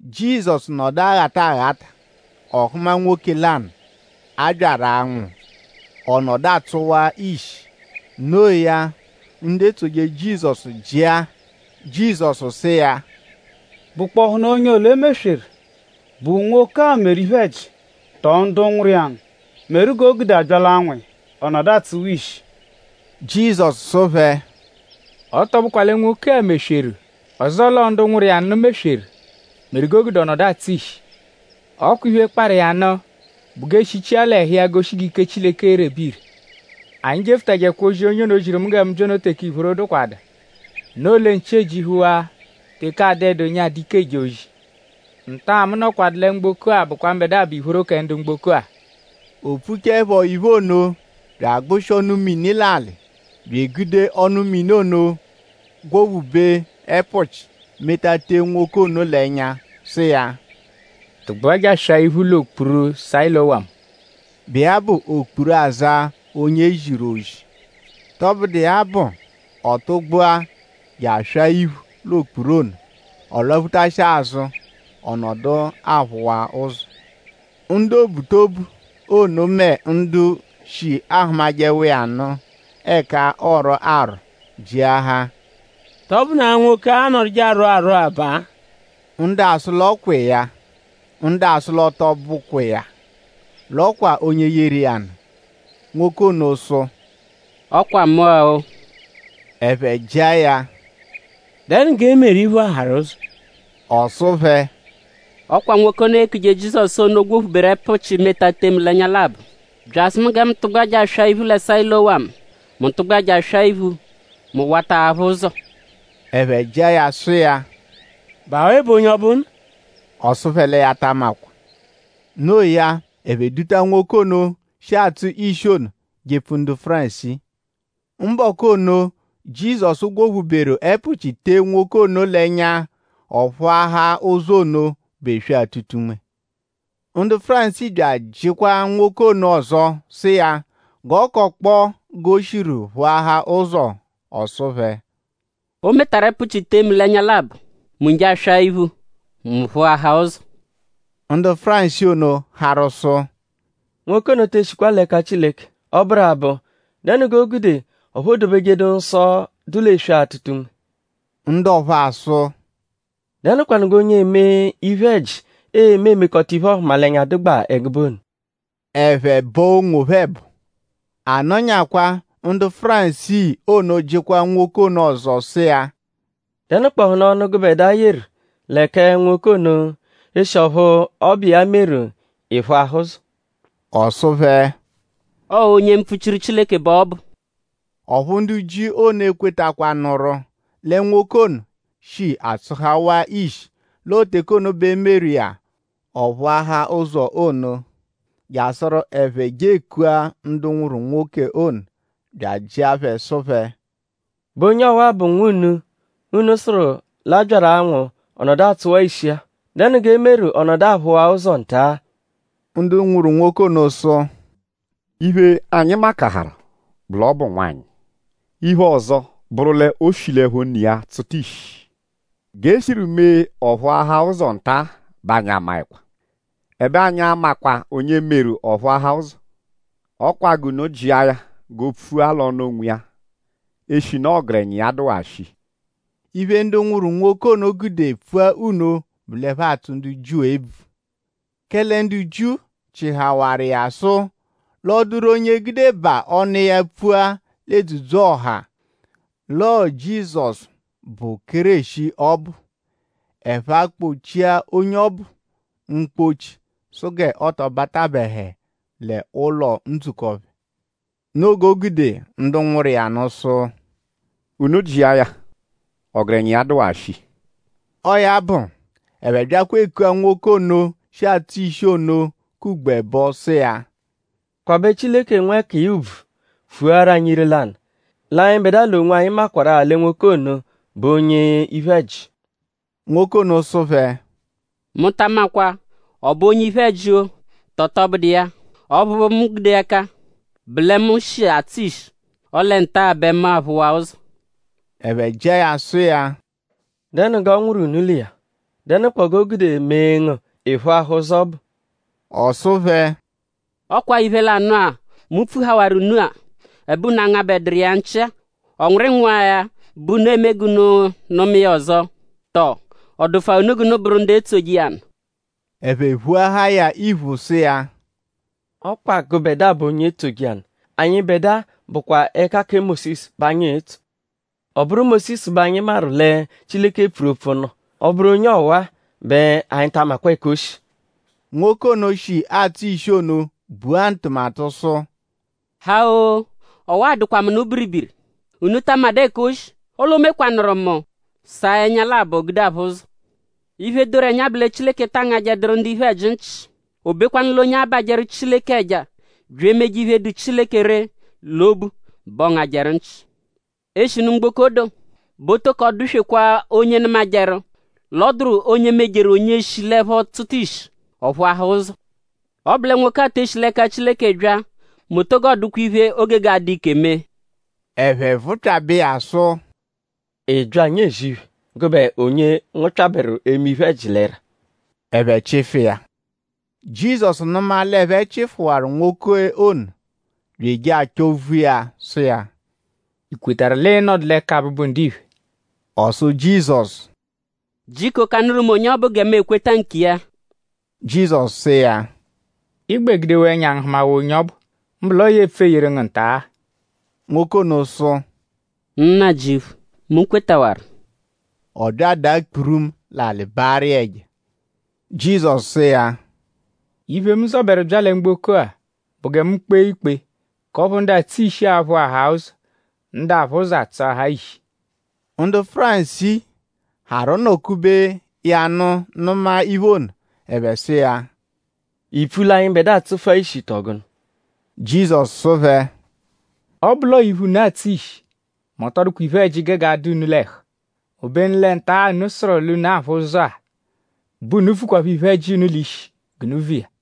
Jizọsu nọdu aghata aghata; ọ hụma nwoke lanụ, a byaru anwụ ọ nọdu atsụwaa ishi. Noo ya; ndu etsoje Jizọsu jịa Jizọsu sụ iya: “?Bụkpohuna onye ole mesweru??Bụ nwoke-a meru iphe-ẹji; tọo ndu nwụru iya nụ, meru g'o gude a bya l'anwụ iya; ọ nọdu atsụwaa ishi?” Jizọsu sụ phẹ: “Ọ tọ bụkwa lẹ nwoke-a mesweru; ọzoo l'ọo ndu nwụru iya nụ mesweru meru g'o gude; ọ nọdu atsụ ishi. Ọ kwa iphe, kparụ iya nụ bụ; g'e shichia l'ẹhu iya goshi g'ike kẹ Chileke erebe ire. Anyi jefụtajekwa ozi onye ono, ziru mu gẹ mu bya ono teke ìphóró dụkwadu. Noo le nchi ejihuwaa teke adụedu onye adụ ike eje ozi. Nta-a, mu nọkwadu lẹ mgboko-a bụkwa mbẹdua bụ ìphóró kẹ ndu mgboko-a.” O pfuchaẹpho iphe ono bya agbụshi ọnu-mini l'alị bya egude ọnu-mini ono gwọ-phube ẹpuchi meta tee nwoke ono l'ẹnya; sụ iya: “Tụgbua je aswaa iphu l'okpuru Sayilowamu,” bụ iya bụ okpuru, aza “onye e ziru ozi.” Tọbudu iya bụ; ọ tụgbua je aswaa iphu l'okpuru ono. Ọ lwaphutashia azụ; ọ nọdu aphụwaa ụzo. Ndu obutobu ono mẹ ndu shi ahụmajewa iya nụ ẹka ọorwo arwọ jịahaa: “?Tọ bụna-a nwoke-a, anọduje arwọ arwọ-a baa?” Ndu asụ l'ọ kwa iya-a; ndu asụ l'ọ tọ bụkwa iya; l'ọ kwa onye yeru iya nụ. Nwoke ono sụ: “Ọ kwa mu-a-o.” Ẹphe jịa ya: “?Dẹnu g'e meru ị phụaharu ụzo?” Ọ sụ phẹ: “Ọ kwa nwoke ono, eekuje Jizọsu ono gwọ-phuberu ẹpuchi meta tee mu l'ẹnya labọ; bya asụ mu gẹ mu tụgbua je aswaa iphu lẹ Sayilowamu; mu tụgbua je aswaa iphu; mu wata aphụ ụzo.” Ẹphe jịa ya sụ iya: “?Bụ awe bẹ onye ọbu nọ?” Ọ sụ phẹ lẹ ya ta amakwa. Noo ya; ẹphe duta nwoke ono, shi atsụ ishi ono jepfu ndu Fárisii. Mbọku ono, Jizọsu gwọ-phuberu ẹpuchi tee nwoke ono l'ẹnya ọ phụahaa ụzo ono bụ eswe-atụta-unme. Ndu Fárisii bya ajịkwaa nwoke ono ọzo sụ iya g'ọ kọkpoo g'o shiru phụahaa ụzo. Ọ sụ phẹ: “O metaru ẹpuchi tee mu l'ẹnya labọ; mu je aswaa iphu; mu phụahaa ụzo.” Ndu Fárisii ono harụ sụ: “Nwoke ono te eshikwa l'ẹka Chileke; ọ -bụru 'abụ?dẹnu g'o gude ọphu o dobejedu nsọ, dụ l'eswe-atụta-unme?” Ndu ọphu asụ: “?Dẹnukwanu g'onye eme iphe-ẹji e-me emekọta iphe-ọhumalenya, dụgbaa ẹgube ono.” Ẹphe bọo onwophẹ ẹbo. A nọnyakwaa; ndu Fárisii ono jịkwaa nwoke ono ọzo sụ iya: “?Dẹnukpohuna ọnu, gụbedua yeru lẹ kẹ nwoke ono; eshi ọphu ọ bụ iya meru; ị phụahaa ụzo.” Ọ sụ phẹ: “Ọo onye mpfuchiru Chileke bẹ ọ bụ.” Ọphu ndu Jiu ono ekwetakwanụru lẹ nwoke ono shi atsụhawaa ishi; l'ọo teke ono bẹ e meru iya; ọ phụahaa ụzo ono; jasụru ẹphe je ekua ndu nwụru nwoke ono; bya ajịa phẹ sụ phẹ: “?Bụ onye ọwa-a bụ nwa unu, unu sụru l'a byaru anwụ ọ nọdu atsụwaa ishi-a??Dẹnu g'e meru ọ nọdu aphụwaa ụzo nta-a?” Ndu nwụru nwoke ono sụ: “Iphe, anyi makaharụ bụ l'ọ bụ nwa anyi. Iphe ọzo bụru l'o shi l'ẹpho ne iya tsụta ishi. G'e shiru mee ọ phụahaa ụzo nta-a bẹ anyi amaẹkwa. Ẹbe anyi amakwa onye meru; ọ phụahaa ụzo. Ọ kwa g'unu jịa ya g'o pfua l'ọnu onwiya; eshinu ọgerenya iya dụwaa shii.” Iphe, ndu nwụru nwoke ono gude pfua nno bụ l'ẹphe atsụ ndu Jiu ebvu; kẹle ndu Jiu chịhawaru iya sụ l'ọ -dụru onye gudebaa ọnu iya pfua l'edzudzu-ọha l'ọo Jizọsu bụ Kéreshi ọbu; ẹphe akpọ-chia onye ọbu mkpọ-chi sụ g'ọ tọ batabahẹ l'ụlo-ndzukọ phẹ. Noo g'o gude ndu nwụru iya nụ sụ: “Unu jịa ya; ọgerenya iya dụwaa shii.” Ọo ya bụ; ẹphe byakwa ekua nwoke ono, shi atsụ ishi ono k'ugbo ẹbo sụ iya: “Kwabẹ Chileke nwẹkiya ùbvù; pfuaru anyi ire-lanụ; l'anyịbedua l'onwanyi maakwaru lẹ nwoke ono bụ onye iphe-ẹji.” Nwoke ono sụ phẹ: “Mu ta amakwa?ọ bụ onye iphe-ẹji-o tọo tọ bụdu iya. Ọphu mu gude ẹka bụ lẹ mu shi atsụ ishi; ọle nta-a bẹ mu aphụwaa ụzo.” Ẹphe jịa ya sụ iya: “?Dẹnu g'ọ nwụru unu l'iya??Dẹnukpoo g'o gude mee ngu; ị phụahaa ụzo ọbu?” Ọ sụ phẹ: “Ọ kwa-a iphe lanụ-a, mu pfuhawaru unu-a; ẹbe unu angabẹduru iya nchị-a.?Ọ nwụru ịnwu-agha bẹ unu eme g'unu nụma iya ọzo? Tọo?ọ dụfua unu g'unu bụru ndu etsoje iya nụ?” Ẹphe phuahaa ya iphu sụ iya: “Ọ kwa gụbedua bụ onye etsoje iya nụ! Anyịbedua bụkwa ẹka kẹ Mósisu bẹ anyi etso! Ọ bụru Mósisu bẹ anyi maru lẹ Chileke pfuru opfu nụ. Ọ -bụru onye ọwa-a bẹ anyi ta amakwa ẹka o shi.” Nwoke ono, shi atsụ ishi ono bua ntụmatu sụ: “Ha-oo! Ọwa-a dụkwa mu nụ biribiri! Unu ta amadụ ẹka o shi; ọle o mekwanụru; mu saa ẹnya labọ gude aphụ ụzo. Iphe, doru ẹnya bụ lẹ Chileke ta angajẹduru ndu iphe-ẹji nchị; o bekwanụ l'onye abajẹru Chileke ẹja bya emeje iphe, dụ Chileke ree l'obu bẹ ọongajeru nchị. Eshinu mgboko dụ bẹ ọ tọko dụ-swekwaa onye nụmajeru l'ọ dụru onye mejeru onye shi l'ẹpho tsụta ishi; ọ phụahaa ụzo. Ọ -bụ lẹ nwoke-a te shi l'ẹka Chileke bya; mẹ ọ tọ dụkwa iphe, o gege adụ ike mee.” Ẹphe vụpyabe iya sụ: “?Ịibya anyi ezi iphe! Gụbe onye ngụpyaberu eme iphe-ẹji l'ẹra?” Ẹphe chịfu iya. Jizọsu nụma l'ẹphe chịfuwaru nwoke ono bya eje achọ-vu iya sụ iya: “?I kwetarụ l'ịi-nọdu l'ẹka Abụbu-Ndiphe?” Ọ sụ Jizọsu: “Jiko kanụru mu onye ọ bụ gẹ mu ekweta nkiya.” Jizọsu sụ iya: “Ị gbẹ gudewaa ẹnya ngu hụmawaa onye ọbu. Mbụ l'ọo ya epfu eyeru ngu nta-a.” Nwoke ono sụ: “Nnajịuphu! Mu kwetawaru!” Ọ bya adaa kpurumu l'alị baarụ iya ẹja. Jizọsu sụ iya: “Iphe, mu zọberu bya lẹ mgboko-a bụ gẹ mu kpee ikpe; k'ọphu ndu atsụ ishi a-phụahaa ụzo; ndu aphụ ụzo a-tsụahaa ishi.” Ndu Fárisii, harụ nọ-kube iya nụ nụma iphe ono; ẹphe sụ iya: “?Iipfu l'anyịbedua atsụfua ishi tọo gụnu?” Jizọsu sụ phẹ: “Ọ -bụ l'ọo iphe unu atsụ ishi; mẹ ọ tọ dụkwa iphe-ẹji gege adụ unu l'ẹhu. Obenu lẹ nta-a, unu sụru l'unu aphụ ụzo-a bẹ unu vukwaphọ iphe-ẹji unu l'ishi g'unu vu iya.”